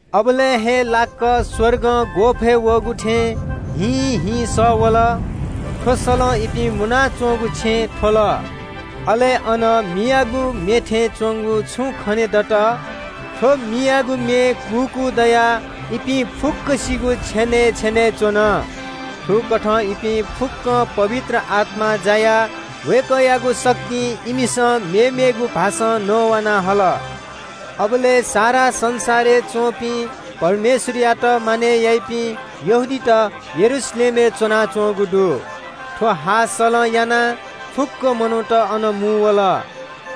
अबलय् हे लाक्‍क स्‍वर्गं ग्‍वःफय् वःगु थें ह्वीं ह्वीं सः वल। थ्‍व सलं इपिं मुनाच्‍वंगु छेँ थ्‍वल। अले अन मियागु मे थें च्‍वंगु छुं खनेदत। थ्‍व मियागु मे कूकू दयाः इपिं फुक्‍कसिगु छेनय् छेनय् च्‍वन। थुकथं इपिं फुक्‍कं पवित्र आत्‍मां जायाः वय्‌कःयागु शक्तिं इमिसं मेमेगु भाषां नवाना हल। अबलय् सारा संसारय् च्‍वंपिं परमेश्‍वरयात मानय् याइपिं यहूदीत यरूशलेमय् वयाच्‍वंगु दु। थ्‍व हाःसलं यानाः फुक्‍क मनूत अन मुंवल।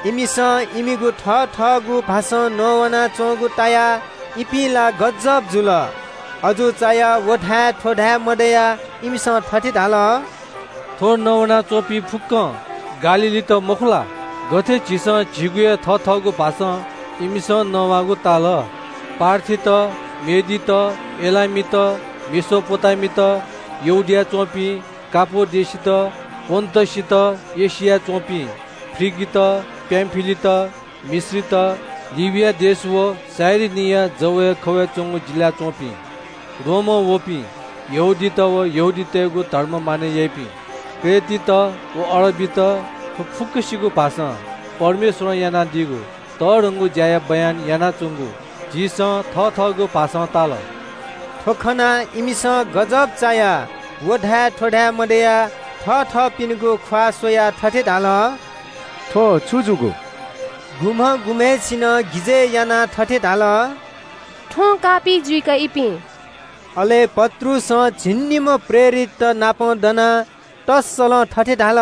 इमिसं इमिगु थथःगु भाषां नवानाच्‍वंगु तायाः इपिं छक्‍क जुल। अजू चायाः व धाये थ्‍व धाये मदयाः इमिसं थथे धाल – “थ्‍व नवाना च्‍वंपिं फुक्‍कं गालीलीत मखु ला? गथे झीसं झीगु हे थथःगु भाषां इमिसं नवाःगु ताल? पार्थीत, मादीत, एलामीत, मेसोपोटामित, यहूदियाय् च्‍वंपिं, कापाडोकित, पोन्‍टसय् व एशियाय् च्‍वंपिं, फ्रिगित, पामफिलित, मिश्रीत, लिबिया देश व कुरेनीया जवय् खवय् च्‍वंगु जिल्‍लाय् च्‍वंपिं, रोमं वःपिं यहूदीत व यहूदीतय्‌गु धर्म मानय् याइपिं, क्रेटीत व अरबीत, थ्‍व फुक्‍कसिगु भाषां परमेश्‍वरं यानादीगु तःधंगु ज्‍याया बयान इमिसं यानाच्‍वंगु झीसं थथःगु भाषां ताल।” थ्‍व खनाः इमिसं गजब चायाः व धाये थ्‍व धाये मदयाः थथःपिनिगु ख्‍वाः स्‍वयाः थथे धाल – “थ्‍व छु जूगु?” गुम्‍ह गुम्‍हय्‌सिनं गिजय् यानाः थथे धाल – “थ्‍वं काःपिं जुइ का, इपिं?” अले पत्रुसं झिंनिम्‍ह प्रेरिततनापं दनाः तःसलं थथे धाल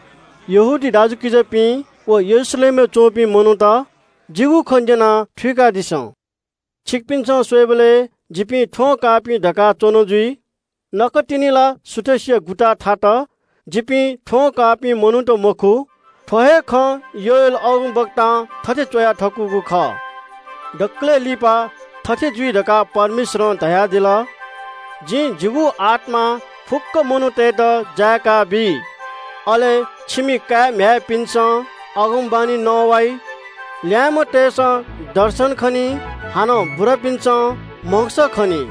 – “यहूदी दाजुकिजापिं व यरूशलेमय् वःपिं मनूत, जिगु खँ न्‍यनाः थुइकादिसँ। छिकपिन्‍सं स्‍वयेबलय् थुपिं थ्‍वं काःपिं धकाः च्‍वन जुइ। नकतिनि ला सुथसिया गुताः थात। थुपिं थ्‍वं काःपिं मनूत मखु। थ्‍व हे खँ योएल अगमवक्तां थथे च्‍वया थकूगु खः – “‘दकलय् लिपा थथे जुइ धकाः परमेश्‍वरं धयादिल – जिं जिगु आत्‍मा फुक्‍क मनूतय्‌के प्‍वंकाबी। अले छिमि काय् म्‍ह्याय्‌पिन्‍सं अगमवाणी नवाइ। छिमि बुरापिं मनूतय्‌सं म्‍हगस खनी। अले छिमि ल्‍याय्‌म्‍ह मनूतय्‌सं दर्शन खनी।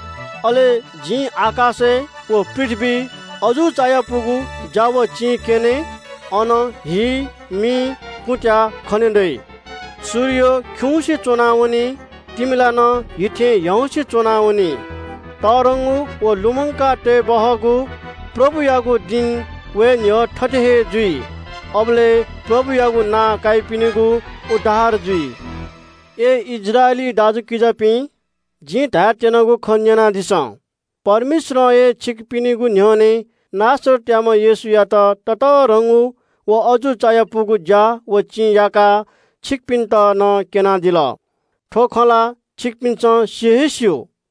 अले आकाशय् व पृथ्‍वीइ जिं अजू चायापुगु ज्‍या व चिं क्‍यने। अन हि, मि, कुँत्‍याः खने दइ। सूर्य खिउँसे च्‍वनावनी। तिमिला हि थें ह्याउँसे च्‍वनावनी। परमप्रभु खने दःवइगु तःधंगु व ग्‍यानापुसे च्‍वंगु दिं वये न्‍ह्यः थथे हे जुइ। अबलय् परमप्रभुयागु नां काइपिनिगु उद्धार जुइ।’” “अय् इस्राएली दाजुकिजापिं, जिं धायेत्‍यनागु खँ न्‍यनादिसँ – परमेश्‍वरं हे छिकपिनिगु न्‍ह्यःने नासरतयाम्‍ह येशूयात ततःधंगु व अजू चायापुगु ज्‍या व चिं याकाः छिकपिन्‍त नं क्‍यनादिल। थ्‍व खँ ला छिकपिन्‍सं सि हे स्‍यू।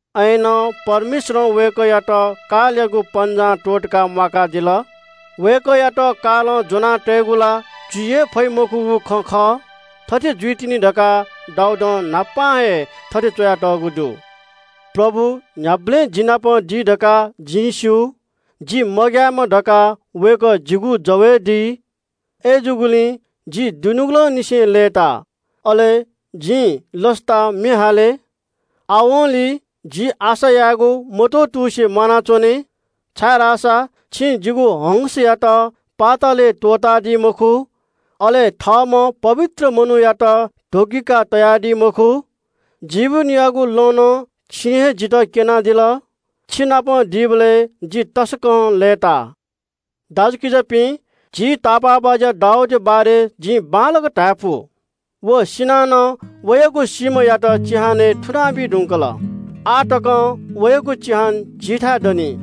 अय्‌नं परमेश्‍वरं वय्‌कःयात कालयागु पन्‍जां त्‍वःतकाः म्‍वाकादिल। वय्‌कःयात कालं ज्‍वना तयेगु ला जुइ हे फइ मखुगु खँ खः। थथे जुइतिनि धकाः दाऊदं न्‍हापा हे थथे च्‍वयातःगु दु – “‘परमप्रभु न्‍ह्याबलें जि नाप दी धकाः जिं स्‍यू। जि मग्‍यायेमा धकाः वय्‌कः जिगु जवय् दी। अय्‌जूगुलिं जि दुनुगलंनिसें लय्‌ता, अले जिं लसतां म्‍ये हाले। आवंलि जि आशा यायेगु मत्‍वतुसे म्‍वानाच्‍वने, छाय्‌धाःसा छिं जिगु आत्‍मायात पातालय् त्‍वःतादी मखु। अले थःम्‍ह पवित्र मनूयात ध्‍वगिकाः तयादी मखु। जीवनयागु लँ नं छिं हे जितः क्‍यनादिल। छिनाप दीबलय् जि तसकं लय्‌ता।’” “दाजुकिजापिं, झी तापाःबाज्‍या दाऊदया बारे जिं बांलाक धायेफु – व सिनाः नं वयागु सीम्‍हयात चिहानय् थुनाबी धुंकल। आः तकं वयागु चिहान द हे दनि।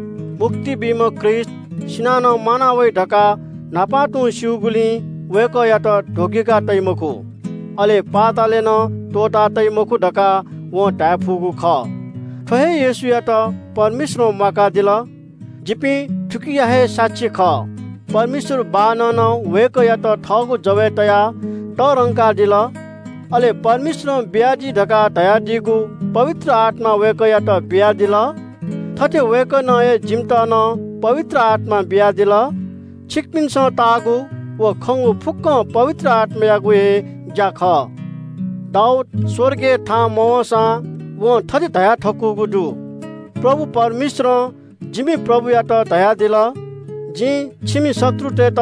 मुक्ति बीम्‍ह ख्रीष्‍ट सिनाः नं म्‍वाना वइ धकाः न्‍हापां तुं स्‍यूगुलिं वय्‌कःयात ध्‍वगिका तइ मखु, अले पातालय् नं त्‍वःता तइ मखु धकाः वं धाये फुगु खः। “थ्‍व हे येशूयात परमेश्‍वरं म्‍वाकादिल। जिपिं थुकिया हे साक्षी खः। परमेश्‍वर बाःनं नं वय्‌कःयात थःगु जवय् तयाः तःधंकादिल। अले परमेश्‍वरं बियादी धकाः धयादीगु पवित्र आत्‍मा वय्‌कःयात बियादिल। थथे वय्‌कलं हे जिमित नं पवित्र आत्‍मा बियादिल। छिकपिन्‍सं ताःगु व खंगु फुक्‍कं पवित्र आत्‍मायागु हे ज्‍या खः। दाऊद स्‍वर्गय् थाहां मवंसां वं थथे धयाथकूगु दु – “‘परमप्रभु परमेश्‍वरं जिमि प्रभुयात धयादिल – जिं छिमि शत्रुतय्‌त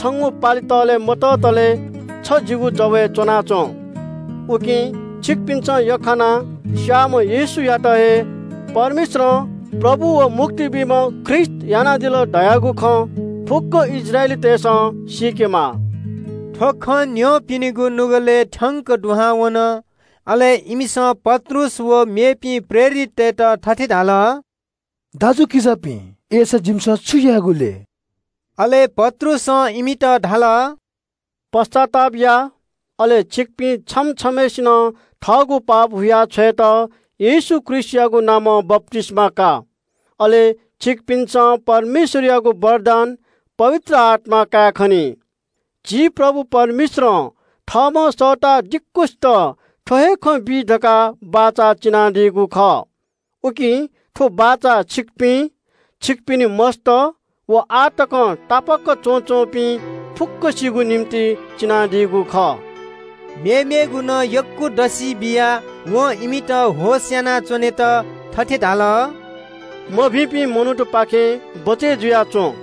छंगु पालि तःले मततले छ जिगु जवय् च्‍वनाच्‍वँ।’ “उकिं छिकपिन्‍सं यख्‍खानाः स्‍याःम्‍ह येशूयात हे परमेश्‍वरं प्रभु व मुक्ति बीम्‍ह ख्रीष्‍ट यानादिल धयागु खँ फुक्‍क इस्राएलीतय्‌सं सीकेमाः।” थ्‍व खँ न्‍यंपिनिगु नुगलय् थ्‍यंक दुहां वन। अले इमिसं पत्रुस व मेपिं प्रेरिततय्‌त थथे धाल – “दाजुकिजापिं, अय्‌सा जिमिसं छु यायेगु लय्?” अले पत्रुसं इमित धाल – “पश्‍चाताप या, अले छिकपिं छम्‍ह छम्‍हय्‌सिनं थःगु पापया क्षमा या लागि येशू ख्रीष्‍टयागु नामं बप्‍तिस्‍मा कयादिसँ। अले छिकपिन्‍सं परमेश्‍वरयागु वरदान पवित्र आत्‍मा कायेखनी। झी प्रभु परमेश्‍वरं थःम्‍हं सःता दिक्‍वसित थ्‍व हे खँ बी धकाः बचं बियादीगु खः। उकिं थ्‍व बचं छिकपिं, छिकपिनि मस्‍त व आः तकं तापाक च्‍वनाच्‍वंपिं फुक्‍कसिगु निंतिं बियादीगु खः।” मेमेगु नं यक्‍व दसि बियाः वं इमित होश यानाच्‍वनेत धाल – “थौंकन्‍हय्‌यापिं मनूतपाखें बचय् जुयाच्‍वँ।”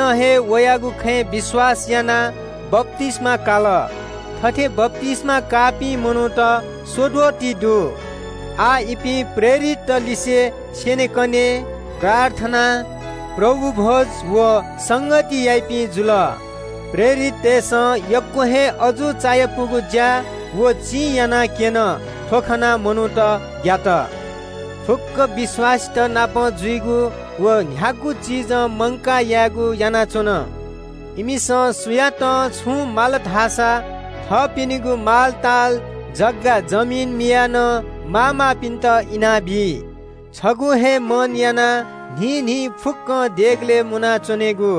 वयागु खँय् विश्‍वास यानाः यक्‍वसिनं हे बप्‍तिस्‍मा काल। उखुन्‍हु हे जक बप्‍तिस्‍मा काःपिं मनूत स्‍वद्वः ति दु। आः इपिं प्रेरितत लिसे स्‍यनेकने, प्रार्थना, प्रभु भ्‍वय् व संगति याइपिं जुल। प्रेरिततय्‌सं यक्‍व हे अजू चायापुगु ज्‍या व चिं यानाक्‍यन। अले थ्‍व खनाः अन दुपिं मनूतय्‌सं परमेश्‍वरया भय काल। फुक्‍क विश्‍वासीतनापं जुइगु व न्‍ह्यागु चिजं मंकाः यायेगु यानाच्‍वन। इमिसं सुयातं छुं माल धाःसा थःपिनिगु मालताल, जग्‍गा जमिन मियाः नं माःमाःपिन्‍त इनाबी। छगू हे मन यानाः न्‍हिं न्‍हिं फुक्‍कं देगलय् मुना च्‍वनेगु,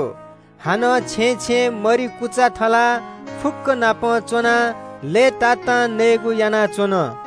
हानं छेँय् छेँय् मरि कुचा थलाः फुक्‍कंनापं च्‍वनाः लय्‌तातां नयेगु यानाच्‍वन।